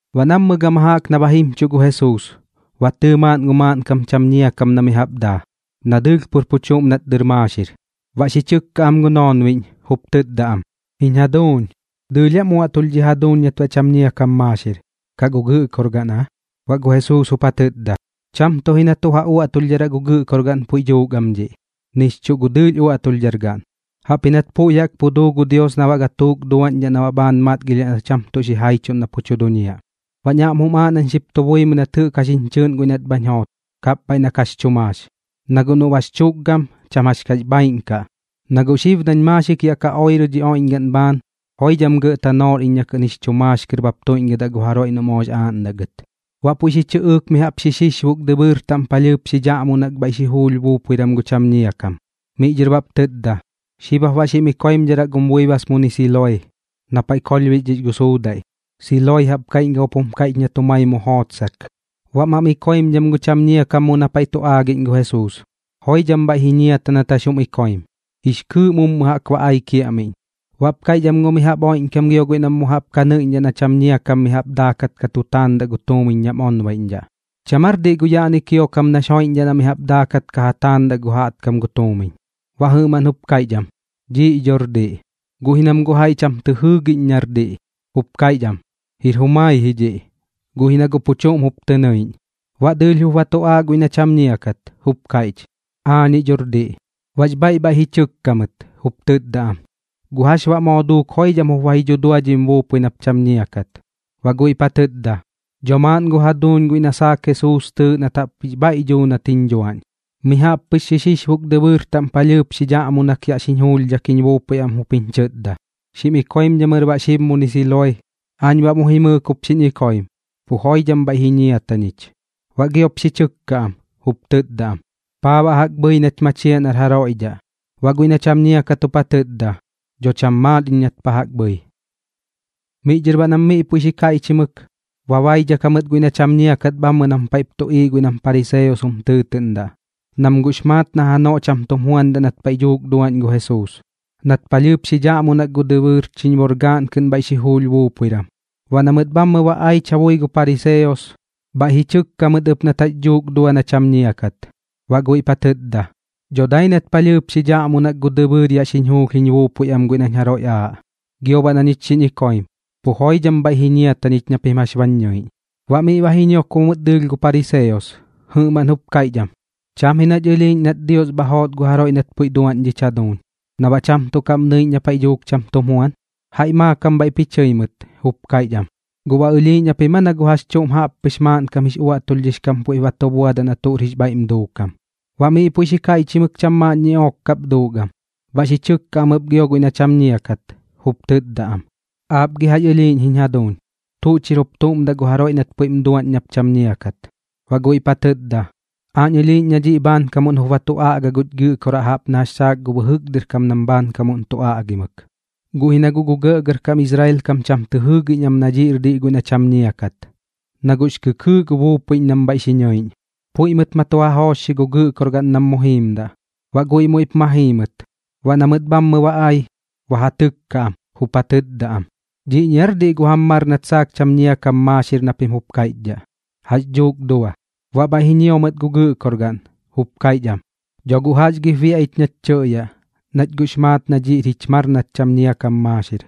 Baꞌ nammɨ gama jaꞌk na ba jimchuꞌ gu Jesuus, ba tɨɨ maaꞌn gu maaꞌnkam cham ñia kam na mi jaꞌp daa, na dɨɨlh pur pu chuꞌm nat dɨr maaxir. Baꞌ xi chɨkka am gu noonbiꞌñ, jup tɨtda am: ―Jiñ jaduuñ, ¿dɨɨlh aam uaꞌtulh dhi jaduuñ nat baꞌ cham ñia kam maaxir, kaꞌ gu gɨꞌkorgaꞌn aa? Baꞌ gu Jesuus jup ja tɨtda: ―Cham tuꞌ ji na tuꞌ ja uaꞌtulhdharaꞌ gu gɨꞌkorgaꞌn puiꞌ dhuuk am dhiꞌ, nix chuꞌ gu dɨɨlh uaꞌtulhdhargaꞌn. Jaꞌpji nat puiꞌ jaꞌk pu duu gu Dios na baꞌ gatuuk duaꞌñdhaꞌ na bhaan matgilhiaꞌ na cham tuꞌ xijaichuꞌn na pu tu duñiaꞌ. Baꞌñ aꞌm jum aaꞌ nañ xip tu buimɨi nat jɨꞌk jax jiñ chɨɨꞌn guiꞌ nat bhañ joot, kapbhaiꞌ na kax chu maax, na guꞌ noꞌ bax chukgam, cham jax kax bhaaiꞌn kaꞌ. Na guꞌ xib nañ maaxik yaꞌ ka oirɨ dhi oiꞌñgaꞌn bhaan, joidham gɇꞌ tanoor iñ na kɨꞌn jix chu maax kɨr bap tuiꞌñgɨdaꞌ gu jaroiꞌ noꞌ moox aaꞌndaꞌ gɨt. Baꞌ puiꞌ xi chɨꞌɨɨk mi jaꞌp xi xixbuk dɨbɨɨr taꞌm palhɨɨp xi dhaꞌmunak bhaiꞌ xi juulh buupuiram gu cham ñia kam. Miꞌ dhɨr baꞌp tɨtda: ―Xib jap baꞌ xim ikoimdharaꞌ gum buibas muni Siloe, na paiꞌ kolhbixdhix gu suudaiꞌ. ―Siloe jaꞌp kaiꞌñkam jup jum kaiꞌch nat jumai mu jootsak. Baꞌ mam ikoimdham gu cham ñia kam mu na paiꞌ tu aagiꞌñ gu Jesuus. Joidham bhaiꞌ ji ñiata nat jax jum ikoim, jix kɨɨꞌ mummu jaꞌk ba ai kiaꞌmiꞌñ. Baꞌp kaiꞌch am gu mi jaꞌp oiꞌñkam gio guiꞌ nam mu jaꞌp ka nɨiꞌñdhaꞌ na cham ñia kam mi jaꞌp daakat ka tu taandaꞌ gu tuumiñ nam onbaiꞌñdhaꞌ: ―¿Cham aar diꞌ gu yaꞌni kiokam nax joiꞌñdhaꞌ na mi jaꞌp daakat ka ja taandaꞌ gu jaꞌtkam gu tuumiñ? Baꞌ jɨꞌmaꞌn jup kaiꞌch am: ―Dhiiꞌ dhor diꞌ. Guꞌ ji nam guꞌ jaiꞌ cham tɨ jɨɨgiꞌñ nar diꞌ, jup kaiꞌch am: ―Jir jumai ji dhiꞌ, guꞌ ji na guꞌ pu chuꞌm jup tɨ nɨiꞌñ. Baꞌ dɨɨlh jup ba tu aaꞌ guiꞌ na cham ñia kat, jup kaiꞌch: ―Aañiꞌ dhor diꞌ. Baꞌx bhaiꞌ bhaiꞌ ji chɨkka mɨt, jup tɨtda am: ―¿Guꞌ jax baꞌ moo duuk joidham jup ba ji dhudua dhim buupui nap cham ñia kat? Baꞌ guiꞌp ja tɨtda: ―Dho maaꞌn gu jaduuñ guiꞌ na saak Jesuus tɨɨꞌ nat jaꞌp jix bhaiꞌ dhuu nat jiñ dhuaꞌñ. Mi jaꞌp pɨx xi xixbuk dɨbɨɨr taꞌm palhɨɨp xi dhaꞌmunak yaꞌ xiñ juulhdhak jiñ buupui am jup jiñ chɨtda: “Xim ikoimdhamɨr baꞌ xib muni Siloe.” Aañ baꞌ mu jimɨɨk jup xiñ ikoim, pu joidham bhaiꞌ ji ñiata ñich. Baꞌ giop xi chɨkka am, jup tɨtda am: ―¿Paa baꞌ jaꞌk bhɨi nach machiaꞌ nar jaroiꞌ dhaꞌ? Baꞌ guiꞌ na cham ñia kat jup ja tɨtda: ―Dho cham maat iñ nat pa jaꞌk bhɨi. Miꞌ dhɨr baꞌ nam miꞌ puiꞌ xi kaiꞌchimɨk, ba baidhak jamɨt guiꞌ na cham ñia kat bhammɨ nam paiꞌp tuꞌiiꞌ guiꞌ nam pariseos jum tɨɨtɨꞌndaꞌ, nam guꞌx maat na janoꞌ cham tum juandaꞌ nat paiꞌ dhuuk duaꞌñ gu Jesuus, nat palhɨɨp xi dhaꞌmunak gu dɨbɨɨr chiñborgaꞌn kɨꞌn bhaiꞌ xi juulh buupuiram. Baꞌ na mɨt bhammɨ ba aich ja bui gu pariseos, bhaiꞌ ji chɨkka mɨt ɨp nat jax dhuuk dua na cham ñia kat. Baꞌ guiꞌp ja tɨtda: ―Dho dai nat palhɨɨp xi dhaꞌmunak gu dɨbɨɨr yaꞌ xiñ juulh jiñ buupui am guiꞌ nañ jaroiꞌ ba aaꞌ, gio baꞌ na ñich xiñ ikoimdham, pu joidham bhaiꞌ ji ñiata ñich na pim jax bañ ñɨiꞌñ. Baꞌ miꞌ ba ji ñiokbo mɨt dɨɨlh gu pariseos, jɨꞌmaꞌn jup kaiꞌch am: ―Cham ji nach ɨlhiiꞌñ nat Dios bha joot gu jaroiꞌ nat puiꞌ duaꞌñ dhich jaduuñ, na baꞌ cham tuꞌ kaꞌm nɨiꞌñ na paiꞌ dhuuk cham tum juan. Jaiꞌ maakam bhaiꞌp ji chɨi mɨt, jup kaiꞌch am: ―¿Guꞌ baꞌ ɨlhiiꞌñ japim aa na gu jax chuꞌm jaꞌppɨx maaꞌnkam jix uaꞌtulhdhix kam puiꞌp ba tu buadaꞌ na tuꞌr jix bhaiꞌm duukam? Baꞌ miꞌ puiꞌ xi kaiꞌchimɨk cham maaꞌn ñiꞌook kap duuk am. Baꞌ xi chɨkka am ɨp gio guiꞌ na cham ñia kat, jup tɨtda am: ―¿Aap gi jax ɨlhiiꞌñ jiñ jaduuñ? ¿Tuꞌ chir jup tuꞌm daꞌ gu jaroiꞌ nat puiꞌm duaꞌñ nap cham ñiakat? Baꞌ guiꞌp ja tɨtda: ―Aañ ɨlhiiꞌñ na dhiꞌ bhaankamuꞌn jup ba tu aꞌga guch Gɨꞌkoraꞌ jaꞌp na jax saak gu bɨjɨk dɨr kam nam bhaankamuꞌn tu aꞌgimɨk. Guꞌ ji na guꞌ gu gɇꞌgɇrkam Israel kam cham tɨ jɨɨgiꞌñ am na dhiꞌr diꞌ guiꞌ na cham ñia kat, na guꞌx kɨkɨɨꞌ gu buupuiꞌñ nam bhaiꞌ xi nɨiꞌñ. Puiꞌ mɨt ma tu ja joochxi gu gɨꞌkorgaꞌn nam mu jiimdaꞌ. Baꞌ guiꞌ muiꞌp ma jii mɨt. Baꞌ na mɨt bhammɨ ba ai, ba ja tɨkka am, jup ja tɨtda am: ―¿Dhiꞌñi aar diꞌ gu jam mar nat saak cham ñia kam maaxir na pim jup kaiꞌchdhaꞌ? ¿Jax dhuuk dua? Baꞌ bhaiꞌ ji ñio mɨt gu gɨꞌkorgaꞌn, jup kaiꞌch am: ―Dho guꞌ jax gip biaꞌ ich nach tɨꞌyaꞌ, nach guꞌx maat na dhiꞌr jich mar nat cham ñia kam maaxir.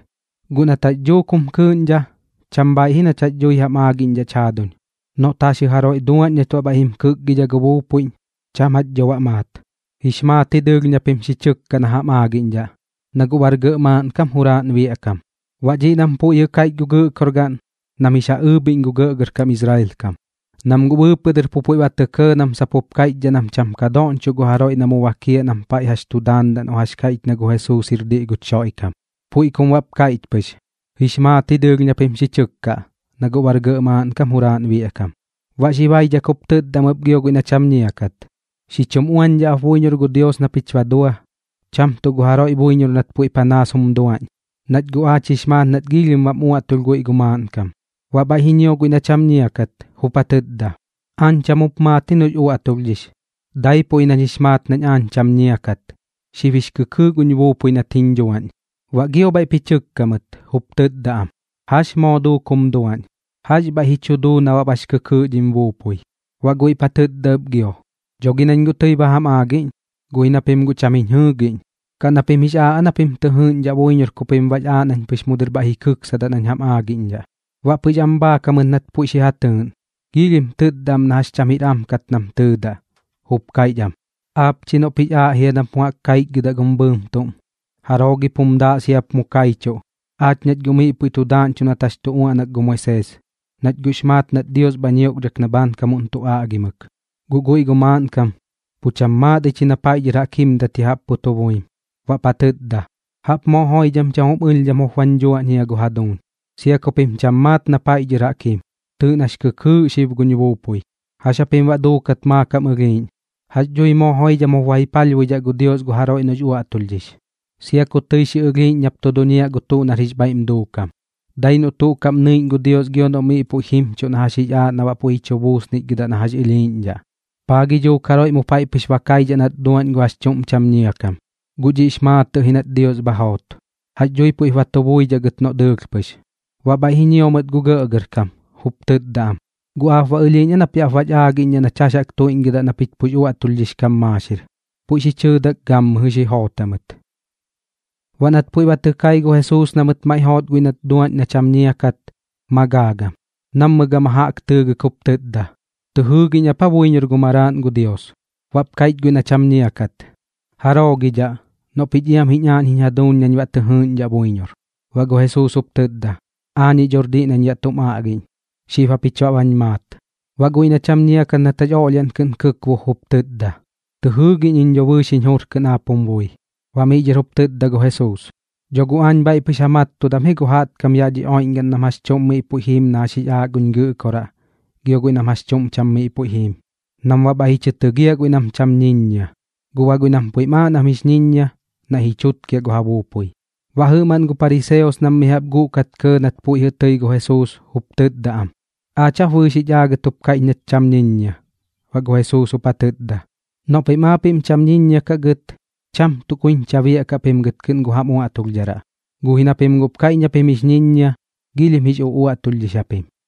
Guꞌ nat jax dhuuk jum kɨɨꞌñdha, cham bhaaiꞌ ji nach jax dhui jax aagiꞌñdhaꞌch jaaduñ, noꞌt jaxjɨ jaroiꞌ duaꞌñ nat baꞌ bhaiꞌ jim kɨkgidha gu buupuiꞌñ, cham jach dho baꞌ maat. Jix maat ji dɨɨlh na pim xi chɨkkaꞌ na jam aagiꞌñdhaꞌ, na guꞌ bar gɇꞌ maaꞌnkam juraaꞌn biaꞌ kam. Baꞌ dhiꞌ nam puiꞌ jɨꞌ kaiꞌch gu gɨꞌkorgaꞌn, nam jix ja ɨɨbhiꞌñ gu gɇꞌgɇrkam Israel kam, nam guꞌ bɨɨpɨꞌ dɨr pu puiꞌ ba tɇ kɇɇ nam sap jup kaiꞌchdhaꞌ nam cham ka doꞌñchoꞌ gu jaroiꞌ na mu bakiaꞌ nam paiꞌ jax tu daandaꞌ noꞌ jax kaiꞌch na gu Jesuus jir diꞌ guch Xoiꞌkam. Puiꞌ kum baꞌp kaiꞌch pɨx: “Jix maat ji dɨɨlh na pim xi chɨkkaꞌ, na guꞌ bar gɇꞌ maaꞌnkam juraaꞌn biaꞌ kam.” Baꞌ xi baidhak jup tɨtda am ɨp gio guiꞌ na cham ñia kat: ―Xi chum uañdhaꞌ ap buiñor gu Dios na pich ba dua, cham tuꞌ gu jaroiꞌ buiñor nat puiꞌ panaas jum duaꞌñ. Nach guꞌ aach jix maat nat giilhim bam uaꞌtulh guiꞌ gu maaꞌnkam. Baꞌ bhaiꞌ ji ñio guiꞌ na cham ñia kat, jup ja tɨtda: ―Aañ cham jup maat ji noꞌx uaꞌtulhdhix, daipuꞌ ji nañ jix maat nañ aañ cham ñia kat. Xib jix kɨkɨɨꞌ guñ buupui nat jiñ dhuaꞌñ. Baꞌ gio bhaiꞌp ji chɨkka mɨt, jup tɨtda am: ―¿Jax moo duuk jum duaꞌñ? ¿Jax bhaiꞌ ji chu duu na baꞌ bax kɨkɨɨꞌ dhim buupui? Baꞌ guiꞌp ja tɨtda ɨp gio: ―Dho gi nañ guꞌ tɨi ba jam aagiꞌñ, guꞌ ji na pim guꞌ cham jiñ jɨɨgiꞌñ. ¿Kaꞌ na pim jix aaꞌ aa na pim tɨ jɨɨꞌñdhaꞌ buiñor ku pim baꞌx aaꞌ nañ pɨx mu dɨr bhaiꞌ ji kɨksadaꞌ nañ jam aagiꞌñdhaꞌ? Baꞌ pɨx am bhaak jamɨt nat puiꞌ xi ja tɨɨꞌn, giilhim tɨtda am na jax cham jir am kat nam tɨɨdaꞌ, jup kaiꞌch am: ―Aap chi noꞌp jix aaꞌ jia nap mu jaꞌk kaichgɨdaꞌ gum bɨɨm tuꞌm. ¿Jaroo gip jum daaꞌ siap mu kaichuꞌ? Aach nach guꞌ miꞌ puiꞌ tu daaꞌñchuꞌ nat jax tu uaꞌnak gu Moisees, nach guꞌx maat nat Dios bha ñioꞌkdhak na baꞌ bhaankamuꞌn tu aꞌgimɨk. Guꞌ guiꞌ gu maaꞌnkam, pu cham maat ich ji na paiꞌ dhɨr jaꞌk jimdat ya jaꞌp pu tu buim. Baꞌp ja tɨtda: ―Jaꞌp moo joidham cham jum ɨlhdham jup bañ dhuaꞌñ jia gu jaduuñ, sia ku pim cham maat na paiꞌ dhɨr jaꞌk jim. Tɨɨꞌ nax kɨkɨɨꞌ xib guñ buupui. ¿Jax japim baꞌ duukat maakam ɨlhiiꞌñ? ¿Jax dhui moo joidham jup ba ji palhbuidhaꞌ gu Dios gu jaroiꞌ noꞌx uaꞌtulhdhix, sia ku tɨi xi ɨlhiiꞌñ nap tu duñiaꞌ gu tuꞌ nar jix bhaiꞌm duukam? Dai noꞌ tuꞌ kaꞌm nɨiꞌñ gu Dios gio noꞌ miꞌ puiꞌ jimchuꞌ na jax jix aaꞌ na baꞌ puiꞌ ji chu buusnichgɨdaꞌ na jax ɨlhiiꞌñdhaꞌ. ¿Paa gi dhuuk jaroiꞌ mu paiꞌ pɨx ba kaidhaꞌ nat ba duaꞌñ gu jax chuꞌm cham ñia kam? Guꞌ dhiꞌx maatɨꞌ ji nat Dios bha joot. ¿Jax dhui puiꞌp ba tu buidhaꞌ gɨt noꞌ dɨɨlh pɨx? Baꞌ bhaiꞌ ji ñio mɨt gu gɇꞌgɇrkam, jup tɨtda am: ―¿Guꞌ aap ba ɨlhiiꞌñ aa nap yaꞌ bach aagiꞌñdhaꞌ nach jax jaꞌk tuiꞌñgɨdaꞌ na pich pux uaꞌtulhdhix kam maaxir? Puiꞌ xi chɨɨdak gammɨjɨ xi joot jamɨt. Baꞌ nat puiꞌ ba tɨ kai gu Jesuus na mɨt maiꞌ joot guiꞌ nat duaꞌñ na cham ñia kat, ma gaagam. Nammɨ gama jaꞌk tɨɨgɨk jup tɨtda: ―¿Tɨ jɨɨgiꞌñ ap aa buiñor gu Maraaꞌn gu Dios? Baꞌp kaiꞌch guiꞌ na cham ñia kat: ―¿Jaroo gi dhaꞌ? Noꞌ pich iam jiñ aaꞌñ jiñ jaduuñ nañ baꞌ tɨ jɨɨꞌñdhaꞌ buiñor. Baꞌ gu Jesuus jup tɨtda: ―Aañiꞌ dhor diꞌ nañ yaꞌ tum aꞌgiꞌñ. Xib japich baꞌ bañ maat. Baꞌ guiꞌ na cham ñia kat nat jax oꞌlhiaꞌn kɨꞌn kɨkbuk jup tɨtda: ―Tɨ jɨɨgiꞌñ iñ dho bɨɨx jiñ jur kɨꞌn aap jum bui. Baꞌ miꞌ dhɨr jup tɨtda gu Jesuus: ―Dho guꞌ aañ bhaiꞌ pɨx ja mattudam ji gu jaꞌtkam yaꞌ dhi oiꞌñgaꞌn nam jax chuꞌm miꞌ puiꞌ jiim na jax jix aaꞌ guñ Gɨꞌkoraꞌ gio guiꞌ nam jax chuꞌm cham miꞌ puiꞌ jiim, nam baꞌ bhaiꞌ ji chɨ tɨgiaꞌ guiꞌ nam cham ñiññia. Guꞌ baꞌ guiꞌ nam puiꞌm aaꞌ nam jix ñiññia, naiꞌ ji chutkiaꞌ gu ja buupui. Baꞌ jɨꞌmaꞌn gu pariseos nam mi jaꞌp guꞌkat kɇɇ nat puiꞌ jɨꞌ tɨi gu Jesuus, jup tɨtda am: ―¿Aach jap bɨɨx jich aagɨt jup kaiꞌch nach cham ñiññia? Baꞌ gu Jesuus jup ja tɨtda: ―Noꞌ pim aapiꞌm cham ñiññia kaꞌ gɨt, cham tuꞌ kuiñcha biaꞌkaꞌ pim gɨt ji kɨꞌn gu jam uaꞌtulhdharaꞌ. Guꞌ ji na pim guꞌp kaiꞌch na pim jix ñiññia, giilhim jix uꞌuaꞌtulhdhix japim.